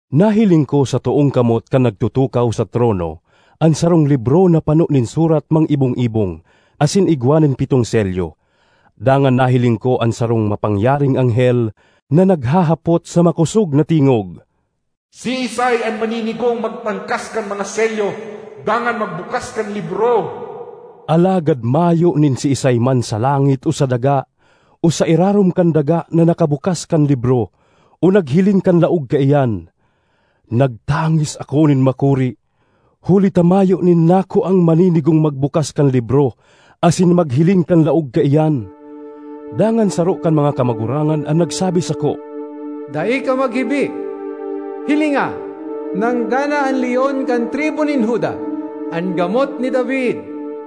Nahiling ko sa toong kamot kan nagtutukaw sa trono an sarong libro na pano nin surat mang-ibong-ibong asin igwa nin pitong selyo. Dangan nahiling ko an sarong mapangyaring anghel na naghahapot sa makosog na tingog, “Siisay an maninigong magtangkas kan mga selyo dangan magbukas kan libro?” Alagad mayo nin siisay man sa langit o sa daga o sa irarom kan daga na nakabukas kan libro o naghiling kan laog kaiyan. Nagtangis ako nin makuri huli ta mayo nin nakuang maninigong magbukas kan libro asin maghiling kan laog kaiyan. Dangan saro kan mga kamagurangan an nagsabi sako, “Dai ka maghibi. Hilinga, nanggana an Leon kan tribu nin Juda, an Gamot ni David,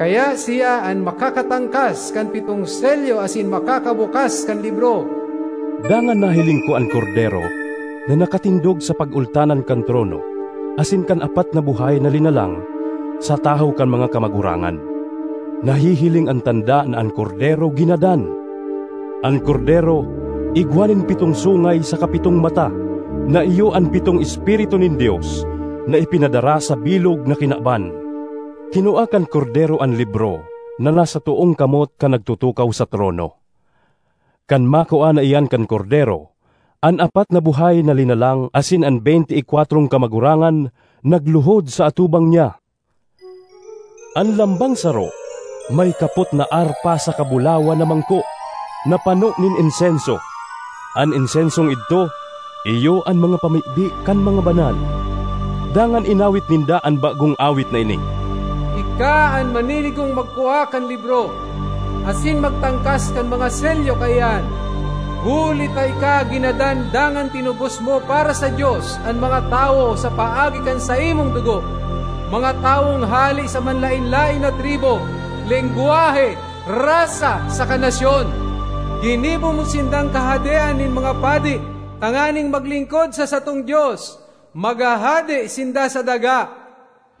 kaya siya an makakatangkas kan pitong selyo asin makakabukas kan libro.” Dangan nahiling ko an Kordero na nakatindog sa pagultanan kan trono asin kan apat na buhay na linalang, sa tahaw kan mga kamagurangan. Nahihiling an tanda na an Kordero ginadan. An Kordero igwa nin pitong sungay saka pitong mata, na iyo an pitong Espiritu nin Dios na ipinadara sa bilog na kinaban. Kinua kan Kordero an libro na nasa toong kamot kan nagtutukaw sa trono. Kan makua na iyan kan Kordero, an apat na buhay na linalang asin an beynte y kwatrong kamagurangan nagluhod sa atubang niya. An lambang saro may kapot na arpa saka bulawan na mangko na pano nin insenso; an insensong idto iyo an mga pamibi kan mga banal. Dangan inawit ninda an bagong awit na ini: “Ika an maninigong magkua kan libro, asin magtangkas kan mga selyo kaiyan. Huli ta ika ginadan dangan tinubos mo para sa Dios an mga tawo sa paagi kan saimong dugo, mga tawong hale sa manlaen-laen na tribu, lengwahe, rasa saka nasyon. Ginibo mo sindang kahadean nin mga padi tanganing maglingkod sa satong Dios; maghahade sinda sa daga.”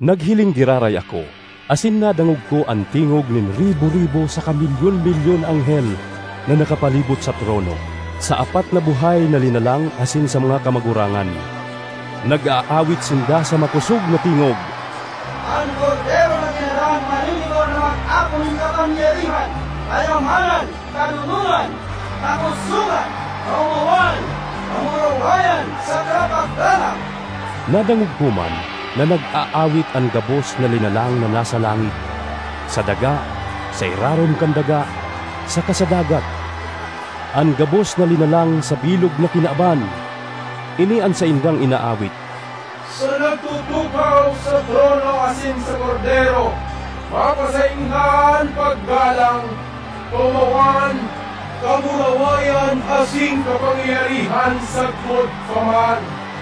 Naghiling giraray ako asin nadangog ko an tingog nin ribo-ribo saka milyon-milyon na anghel na nakapalibot sa trono, sa apat na buhay na linalang asin sa mga kamagurangan. Nag-aawit sinda sa makosog na tingog, “An Kordero na ginadan maninigo na mag-ako nin kapangyarihan, kayamanan, kadonongan, kakosogan, kaomawan, kamurawayan saka paggalang!” Nadangog ko man na nag-aawit an gabos na linalang na nasa langit, sa daga, sa irarom kan daga, saka sa dagat—an gabos na linalang sa bilog na kinaban—ini an saindang inaawit: “Sa nagtutukaw sa trono asin sa Kordero, mapasainda an paggalang, kaomawan, kamurawayan, asin kapangyarihan, sagkod pa man!”